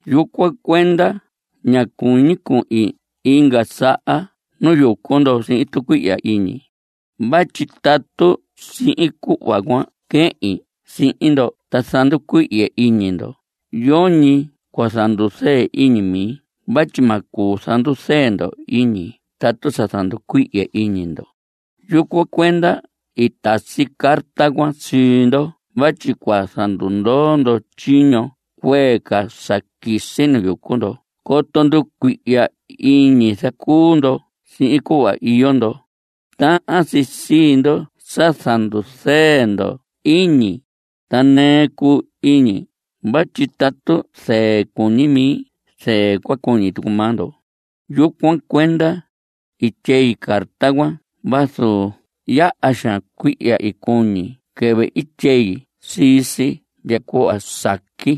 Yucuan cuenda ñá cuñi cuhin inga saha nu yucu ndo sihin tucuihya iñi. Vatyi tatu sihin cuhva cua quehin sihin ndo ta zanducuihye iñi ndo, yoñi cua zanduzɨɨ iñi mi vatyi ma cuu zanduzɨɨ ndo iñi tatu sa zanducuihye iñi ndo. Yucuan cuenda i tasi carta cuan sii ndo vatyi cua zandundoo ndo tyiño cuee ca sa quisi nu yucu ndo coto nducuihya iñi zacuu ndo sihin cuhva iyo ndo. Tahan si sii ndo sa zanduzɨɨ ndo iñi. Ta nɨɨ cuu iñi vatyi tatu zɨɨ cuñi mi, zɨɨ cua cuñi tucu maa ndo. Yucuan cuenda i tyei carta cuan vazu yaha xaan cuihya i cuñi quɨvɨ i tyei sii si ndya cuhva saqui.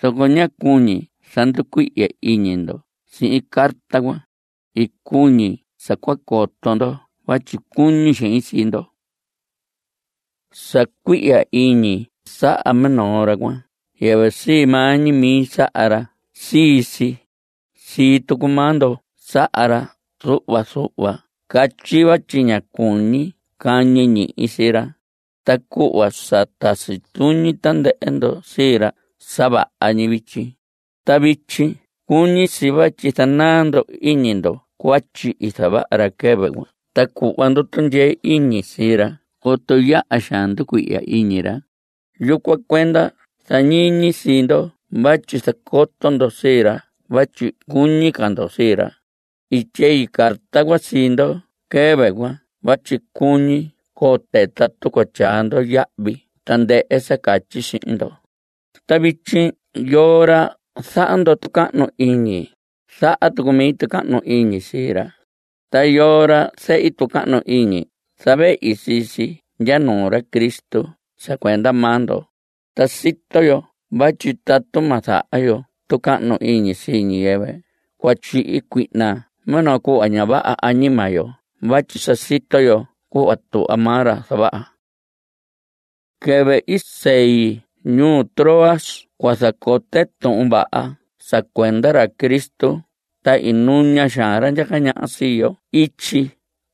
Zoco ñá cuñi zanducuihye iñi ndo sihin carta cuan. I cuñi sa cua coto ndo vatyi cuñi xein sii ndo. Sa cuihya iñi saha minoo ra cuan, yɨvɨ sii maa ñi mi saha ra sii si. Sii tucu maa ndo saha ra zuhva. Zuhva catyi vatyi ña cuñi cañi ñihi sii ra. Ta cuhva sa tasi tuñi tandɨhɨ ndo sii ra, sa vaha ñi vityi. Ta vityi cuñi si vatyi zanaa ndo iñi ndo cuatyi i zavaha ra quɨvɨ cuan ta cuhva ndo tundyee iñi sii ra coto yaha xaan nducuihya iñi ra. Yucuan cuenda zañiñi sii ndo vatyi zacoto ndo sii ra vatyi cuñi ca ndo sii ra. I tyei carta cuan sii ndo quɨvɨ cuan vatyi cuñi cote tatu cua tyaa ndo yahvi tandɨhɨ sa catyi sihin ndo. Ta vityi yoo ra zaha ndo tucahnu iñi, zaha tucu mi tucahnu iñi sii ra. Ta yoo ra zehi tucahnu iñi, zavehi sii si ndya nuu ra Cristo sa cuenda maa ndo. Ta sito yo vatyi tatu ma zaha yo tucahnu iñi sii ñiyɨvɨ, cua tyihi cuihna minoo cuhva ña vaha añima yo vatyi sa sito yo cuhva tuhva maa ra zavaha. Quɨvɨ i sei ñuu Troas cua zacote Tuhun Vaha sa cuenda ra Cristo, ta i nuña xaan ra ndyaca ñaha sii yo ityi,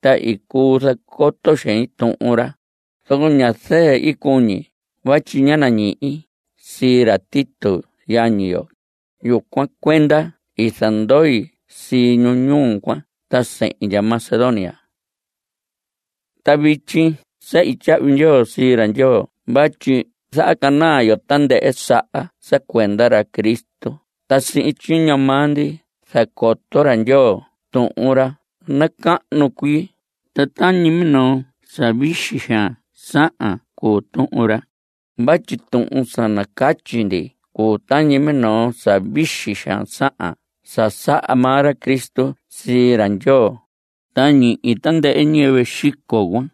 ta i cuu zacoto xein Tuhun ra. Zoco ña zɨɨ i cuñi vatyi ñá nañihi sii ra Tito, yañi yo. Yucuan cuenda i zandoi sii ñu ñuu cuan, ta sehin ndya Macedonia. Ta vityi sehi tyahvi ndyoo sii ra Ndyoo vatyi zahacanaa yo tandɨhɨ saha sa cuenda ra Cristo, ta sihin tyiño maa ndi zacoto ra Ndyoo tuhun ra nacahnu cuii. Ta tañi minoo sa vixi xaan sahan cuu tuhun ra. Vatyi tuhun sa nacatyi ndi cuu tañi minoo sa vixi xaan sahan sa saha maa ra Cristo sii ra Ndyoo. Ta ñihi tandɨhɨ ñiyɨvɨ xico cuan,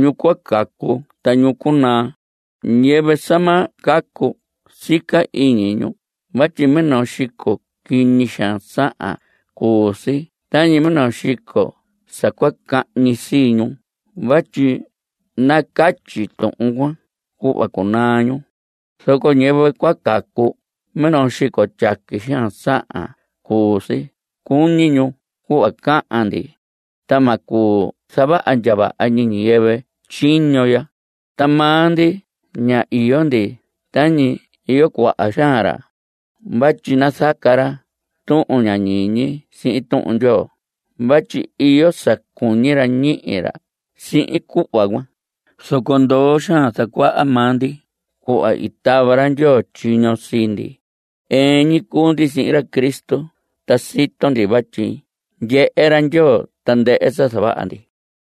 ñu cua cacu ta ñu cunaa. Ñiyɨvɨ sa ma cacu, sica iñi ñu vatyi minoo xico quiñi xaan sahan cuu si tañi minoo xico sa cua cahñi sii ñu vatyi nacatyi tuhun cuan cuhva cunaa ñu. Zoco ñiyɨvɨ cua cacu, minoo xico tyaqui xaan sahan cuu si cuñi ñu cuhva cahan ndi. Ta ma cuu zavaha ndya vaha ñi ñiyɨvɨ tyiño ya. Ta maa ndi ña iyo ndi tañi iyo cuaha xaan ra. Vatyi nazaca ra tuhun ña ñiñi sihin Tuhun Ndyoo vatyi iyo sa cuñi ra ñihi ra sihin cuhva cuan. Zoco ndoo xaan zacuaha maa ndi cuhva i tava ra Ndyoo tyiño sii ndi. Ɨɨn ñi cuu ndi sihin ra Cristo, ta sito ndi vatyi ndyehe ra Ndyoo tandɨhɨ sa zavaha ndi.